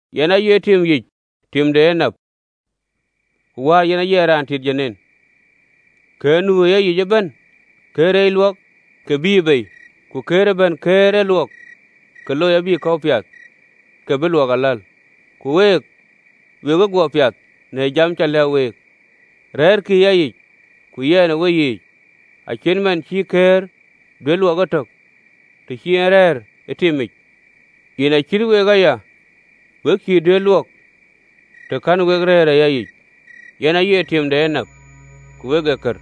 “Yɛn aye tim yic tim de enap, ku Wäär yen aye raan tit dom. Këër nu ë yayic ëbɛ̈n këër reec luɔk, ka bïïyë bei: ku këër ëbɛ̈n këër ee luɔk, ka looi abï kɔ̈u piath, ke bï luɔk aläl. Ku week we cï guɔ piath në jam cä lɛ̈k week. Rɛ̈ɛ̈rkï ë yayic, ku yɛn ë weyiic. Acït man cïï këër duëër luɔk etök, të cïï en rɛ̈ɛ̈r ë timic, yen acït week aya, we cïï duëër luɔk, të kɛ̈n wek rëër ë yayic. “Yɛn ee tim de enap, wek ee kër: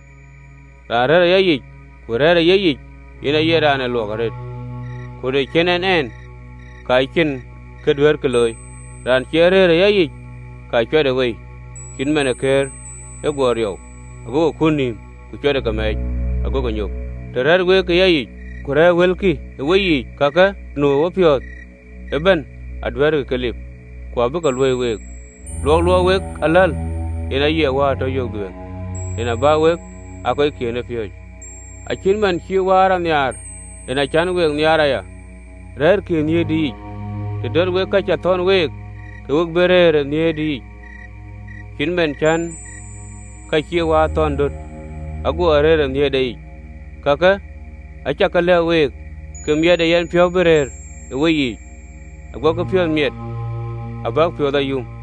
raan rɛ̈ɛ̈r e yayic, ku rɛ̈ɛ̈r ë yeyic, yen aye raan ee luɔk arëët: ku të cïn en ɛn, ka cïn kë duɛ̈ɛ̈rkï looi. Raan cie rëër ë yayic, ka cuɛtë wei cït man ë këër, ago riɔu, ago ke kut nïïm, ku cuɛtë ke mɛɛc, agokï nyop. Të rɛ̈ɛ̈r wek ë yayic, ku rɛ̈ɛ̈r wëlkï ë weyiic, ka kë nu ë wepiɔ̈ɔ̈th ëbɛ̈n aduɛ̈ɛ̈rkï ke lip, ku abï ke luöi week. Luɔk luɔk wek aläl, yen aye Wäär tɔ yök dhuëëŋ, yen abä wek aa kɔckiën ë piööcë. Acït man cï Wäär a nhiaar, en acän we nhiaar aya: rɛ̈ɛ̈rkï ë nhiëërdï yic. Të dɔ̈t wek lööŋ cä thɔ̈n week, ke we bï rëër ë nhiëërdï yic, cït man cän lööŋ cï wäär a thɔn döt, aguɔ rëër ë nhiëërde yic. Kakë acä ke lɛ̈k wek, ke miɛt ë yɛnpiɔ̈u bï rëër ë weyiic, aguɔkï piɔ̈ɔ̈th miɛt abäk piɔ̈ɔ̈th ayum.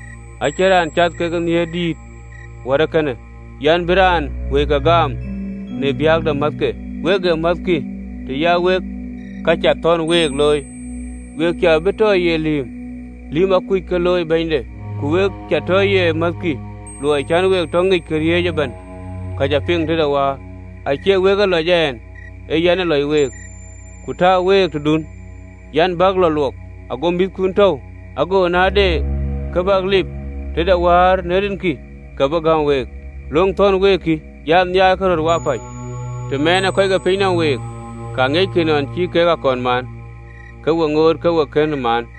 Acïn raan cath ke nhiëër dïït wär ee kënë an, bï raan wëike gaam në biäk de määthke. Wek ee määthkï, të ya wek ka cä thɔ̈n week looi. We cä bï bɛ tɔ ye lïïm, lïm akuc kë looi bɛ̈nyde: ku we cä tɔ ye määthkï, luɔi cän we tɔ ŋic këriëëc ëbɛ̈n ka cä piŋ tëde Wäär. Acie week ë lɔc ɛn, ee yɛn ë lɔc week, ku tääu week tëdun an, bäk lɔ luɔk, ago mïthkun tɔ̈u: ago na de kë bäk lip tëde wäär në rinkï, ka bï gäm week. Löŋ thɔ̈n week kï, an: nhiaarkï röt wapäc. Të mɛɛnë kɔc ke piny nɔm week, ka ŋiɛckï nɔn cï kek a kɔn maan, ke we ŋoot ke we kënë maan.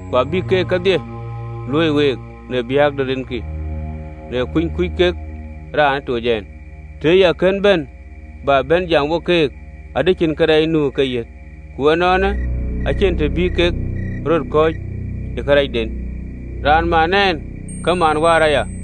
Ku abïk kakë kedhie luöi week në biäk de rinkï, në kuny kuc kek raan ë toc ɛn. Tëë ya kën bɛ̈n jam wo keek, adï cïn kërɛɛc nu ë keyiëth: ku ënɔɔnë, acïn të bï keek röt kɔ̈c e kërɛɛcden. Raan man ɛn ka man Wäär aya.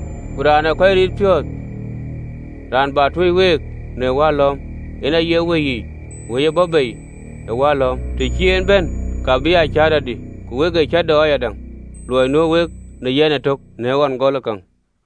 Ku Raan ë kɔc riit piɔ̈ɔ̈th, Raan bä tuöc week në Wäär lɔ̈ɔ̈m, yen aye Wëi yic, Wëi ë bɔ̈ bei ë Wäär lɔ̈ɔ̈m, të cï en bɛ̈n, ka bï aa cäätɔdï. Ku wek ee cäätɔ ayadäŋ, luɔi nuö wek në yɛn ëtök në göl e gɔlë käŋ.